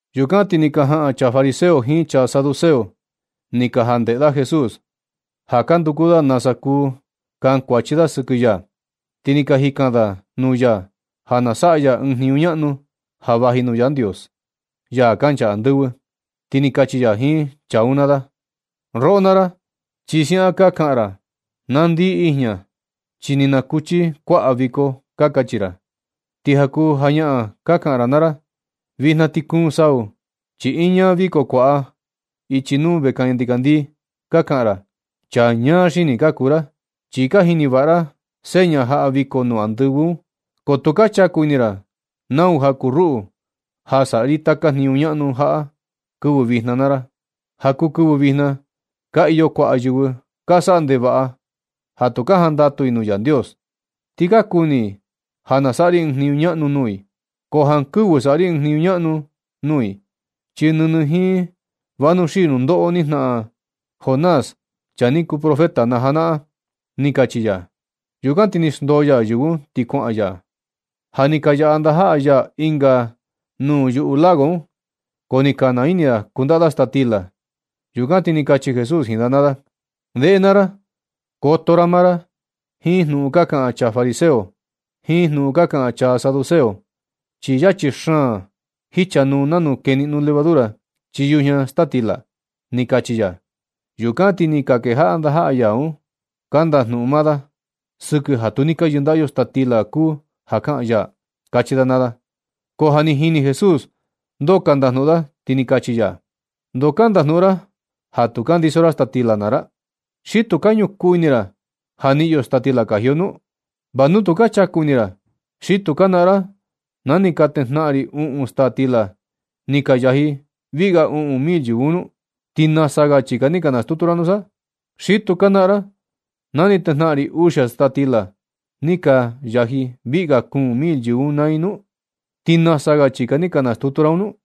Yukan ti ni ka jaꞌan chaa fariseo jiin chaa saduceo ni ka jandeꞌe da Jesús, ja ka nduku da nasa kuu kankuachi da sɨkɨ ya. Ti ni ka jikan da nuu ya ja na saꞌa ya ɨɨn jniñu ñaꞌnu ja vaji nuu Yandios, ya kancha andɨvɨ. Ti ni kachi ya jiin chaa un naa da: ―Roꞌo naa ra, chi siaꞌan ka kaꞌan ra: “Na ndii ijña chi ni nakuchi kuaꞌa viko”, ka kachi ra. Ti ja kuu jañaꞌan ka kaꞌan ra naa ra: “Vijna ti kuun sau chi iña viko kuaꞌa ichi nuu vekaña ndikandii”, ka kaꞌan ra. Chaa ñaa xini ka kuu ra chi ka jini vaꞌa ra seña jaꞌa viko nuu andɨvɨ un, ko tu ka chaku ini ra nau ja kuu ruꞌu, ja saꞌa ri taka jniñu ñaꞌnu jaꞌa kɨvɨ vijna naa ra. Ja kuu kɨvɨ vijna ka iyo kuaꞌa yɨvɨ ka saꞌa ndevaꞌa ja tu ka jandatu i nuu Yandios. Ti ka kuni i ja na saꞌa ri ɨɨn jniñu ñaꞌnu nuu i, ko jankɨvɨ saꞌa ri ɨɨn jniñu ñaꞌnu un nuu i, chi nɨnɨ jiin vanuxii nundoꞌo ni jnaꞌan Jonás, chaa ni kuu profeta na janaꞌan―ni kachi ya. Yukan ti ni xndoo ya yɨvɨ un, ti kuaꞌan ya. Ja ni ka yaꞌa ndajaꞌa ya ɨnga nuu yuꞌu lago un, ko ni ka naa ini da kundaꞌa da staa stila. Yukan ti ni kachi Jesús jiin da naa da: ―Ndeꞌe naa ra, koto ra maa ra jiin jnuꞌun ka kaꞌan chaa fariseo jiin jnuꞌun ka kaꞌan chaa saduceo, chi yachi xaan jichanuu nanu keniꞌno levadura chii yujña staa stila ―ni kachi ya. Yukan ti ni ka kejaꞌa ndajaꞌa ya un ka ndajnuꞌun maa da: ―Sɨkɨ ja tu ni ka yɨndaꞌa yo staa stila kuu ja kaꞌan ya ―kachi da naa da. Ko ja ni jini Jesús ndoo ka ndajnuꞌun da, ti ni kachi ya: ―¿Ndoo ka ndajnuꞌun ra ja tu ka ndiso ra staa stila naa ra? ¿Xi tu ka ñukuu ini ra ja niꞌin yo staa stila kaji yo nu? ¿Va nu tu ka chaku ini ra, xi tu ka naꞌan ra na ni tejnaꞌan ri uꞌun staa stila ni ka yaji viꞌi ga uꞌun mil yɨvɨ un nu? ¿Ti nasa ga chika ni ka nastutu ra nusa? ¿Xi ni tu ka naꞌan ra na ni tejnaꞌan ri uxia staa stila ni ka yaji viꞌi ga kuun mil yɨvɨ un naa i nu? ¿Ti nasa ga chika ni ka nastutu ra un nu?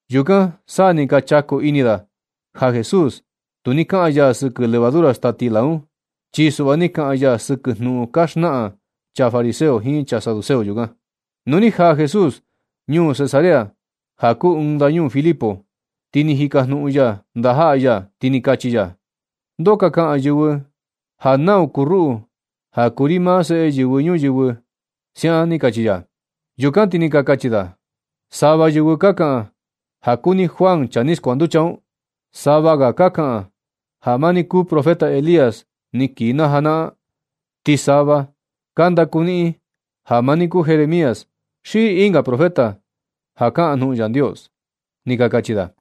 Yukan sa ni ka chaku ini da ja Jesús tu ni kaꞌan ya sɨkɨ levadura staa stila un, chi suꞌva ni kaꞌan ya sɨkɨ jnuꞌun ka xnaꞌan chaa fariseo jiin chaa saduceo yukan. Nu ni jaa Jesús ñuu Cesarea ja kuu ɨɨn ndañuu Filipo, ti ni jikajnuꞌun ya ndajaꞌa ya, ti ni kachi ya: ―¿Ndoo ka kaꞌan yɨvɨ ja nau kuu ruꞌu, ja kuu ri maa Seꞌe Yɨvɨ Ñuyɨvɨ? ―siaꞌan ni kachi ya. Yukan ti ni ka kachi da: ―Sava yɨvɨ ka kaꞌan ja kuu ni Juan ja ni skuanducha un. Sava ga ka kaꞌan ja maa ni kuu profeta Elías ni kii na janaꞌan. Ti sava ka ndaku niꞌin ja maa ni kuu Jeremías xi ɨnga profeta ja kaꞌan jnuꞌun Yandios ―ni ka kachi da.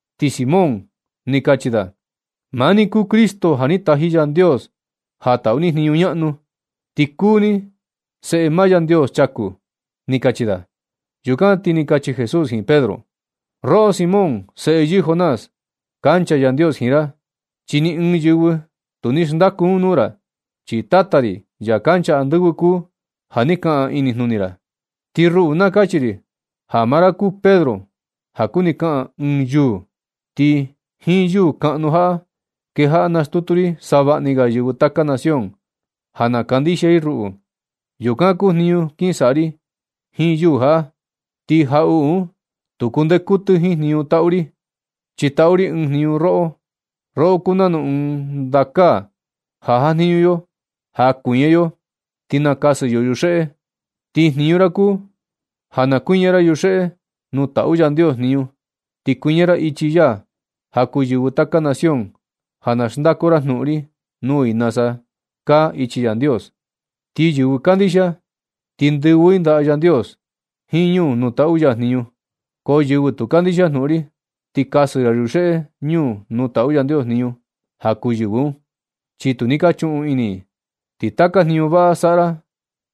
Ti Simón Pedro ni kachi da: ―Maa ni kuu Cristo, ja ni taji Yandios ja taꞌu ni jniñu ñaꞌnu. Ti kuu ni Seꞌe maa Yandios chaku ―ni kachi da. Yukan ti ni kachi Jesús jiin Pedro: ―Roꞌo Simón, seꞌe yɨɨ Jonás, kancha Yandios jiin ra chi ni ɨɨn yɨvɨ tu ni xndaku un nuu ra, chi Tata ri, ya kancha andɨvɨ kuu ja ni kaꞌan inijnuni ra. Ti ruꞌu na kachi ri ja maa ra kuu Pedro, ja kuni kaꞌan “ɨɨn yuu”, ti jiin yuu kaꞌnu jaꞌa kejaꞌa nastutu ri savaꞌani ga yɨvɨ taka nación, ja na kandixia i ruꞌu. Yukan kuu jniñu kin saꞌa ri jiin yuu jaꞌa. Ti jaꞌuꞌu un tu kundee kutɨ jiin jniñu taꞌu ri. Chi tatu ri ɨɨn jniñu roꞌo. Roꞌo kuu nanu ɨɨn ndakaa ja jajniñu yo ja kuiña yo ti nakasɨ yo yuxeꞌe. Ti jniñu ra kuu ja na kuiña ra yuxeꞌe ñuu nuu taꞌu Yandios jniñu. Chi kuiña ra ichi ya ja kuu yɨvɨ taka nación, ja na xndaku ra jnuꞌun ri nuu i nasa kaa ichi Yandios. Ti yɨvɨ kandixia, ti ndɨvɨ i ndaꞌa Yandios jiin ñuu nuu taꞌu ya jniñu. Ko yɨvɨ tu kandixia jnuꞌun ri, ti kasɨ ra yuxeꞌe ñuu nuu taꞌu Yandios jniñu ja kuu yɨvɨ un, chi tu ni ka chuꞌun ini i. Ti taka jniñu vaꞌa saꞌa ra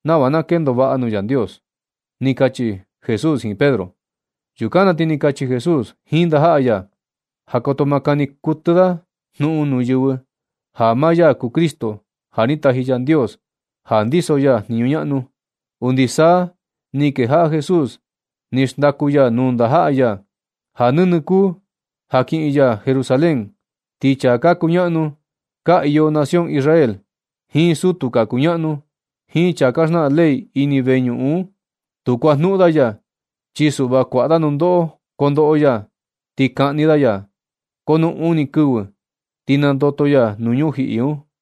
nava na kendo vaꞌa nuu Yandios ―ni kachi Jesús jiin Pedro. Yukan na ti ni kachi Jesús jiin ndajaꞌa ya ja koto ma kani kutɨ da jnuꞌun nuu yɨvɨ ja maa ya kuu Cristo, ja ni taji Yandios ja ndiso ya jniñu ñaꞌnu. Undi sa ni kejaꞌa Jesús ni xndaku ya nuu ndajaꞌa ya, ja nɨnɨ kuu ja kiꞌin ya Jerusalén, ti chaa ka kuñaꞌnu ka iyo nación Israel, jiin sutu ka kuñaꞌnu, jiin chaa ka xnaꞌan ley ini veñuꞌun un, tu kuajnuꞌun da ya, chi suꞌva kuaꞌa da nundoꞌo kondoꞌo ya, ti kaꞌni da ya. Ko nu uni kɨvɨ ti nandoto ya nuu ñujiꞌi un.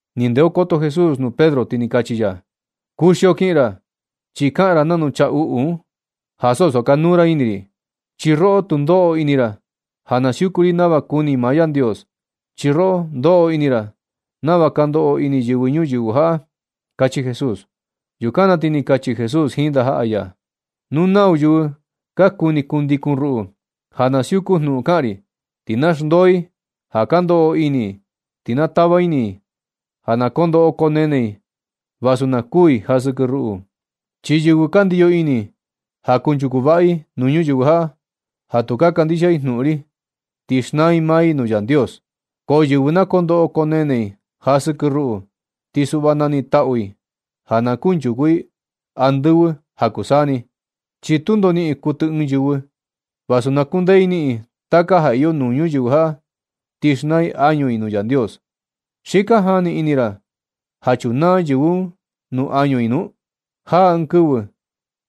Ni ndeokoto Jesús nuu Pedro, ti ni kachi ya: ―Kuxio kiꞌin ra, chi kaꞌan ra nanu chaa uꞌu un, ja so sakanuu ra ini ri. Chi roꞌo tu ndoꞌo ini ra ja na siuku ri nava kuni maa Yandios, chi roꞌo ndoꞌo ini ra nava ka ndoꞌo ini yɨvɨ ñuyɨvɨ jaꞌa ―kachi Jesús. Yukan na ti ni kachi Jesús jiin ndajaꞌa ya: ―Nu nau yɨvɨ ka kuni kundikun ruꞌu, ja na siuku jnuꞌun kaꞌan ri, ti na xndoo i ja ka ndoꞌo ini i, ti na tava ini i ja na kondoꞌo koo nene i vasu na kuu i ja sɨkɨ ruꞌu. Chi yɨvɨ ka ndiyo ini ja kunchuku vaꞌa i nuu ñuyɨvɨ jaꞌa, ja tu ka kandixia i jnuꞌun ri, ti xnaa i maa i nuu Yandios. Ko yɨvɨ na kondoꞌo koo nene i ja sɨkɨ ruꞌu, ti suꞌva na niꞌin taꞌu i ja na kunchuku i andɨvɨ ja kuu saa ni. Chi tundo niꞌin kutɨ ɨɨn yɨvɨ vasu na kundee i niꞌin i taka ja iyo nuu ñuyɨvɨ jaꞌa, ti xnaa i añu i nuu Yandios. ¿Xi ka jani ini ra ja chunaa yɨvɨ un nuu añu i nu? Jaa ɨɨn kɨvɨ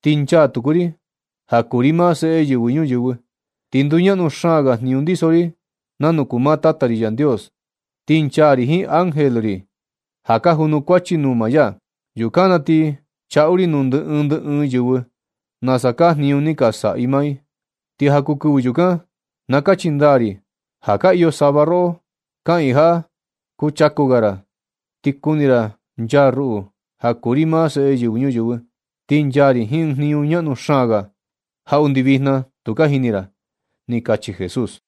ti nchaa tuku ri, ja kuu ri maa Seꞌe Yɨvɨ Ñuyɨvɨ. Ti nduñaꞌnu xaan ga jniñu ndiso ri nanu kuu maa Tata ri Yandios, ti nchaa ri jiin ángel ri ja ka janukuachi nuu maa ya. Yukan na ti chaꞌu ri nuu ndɨ ɨɨn ndɨ ɨɨn yɨvɨ nasa kaa jniñu ni ka saꞌa maa i. Ti ja kuu kɨvɨ yukan, na kachi ndaa ri ja ka iyo sava roꞌo kaꞌiin jaꞌa kuchaku ga ra, ti kuni ra nchaa ruꞌu, ja kuu ri maa Seꞌe Yɨvɨ Ñuyɨvɨ. Ti nchaa ri jiin ɨɨn jniñu ñaꞌnu xaan ga, ja undi vijna tu ka jini ra ―ni kachi Jesús.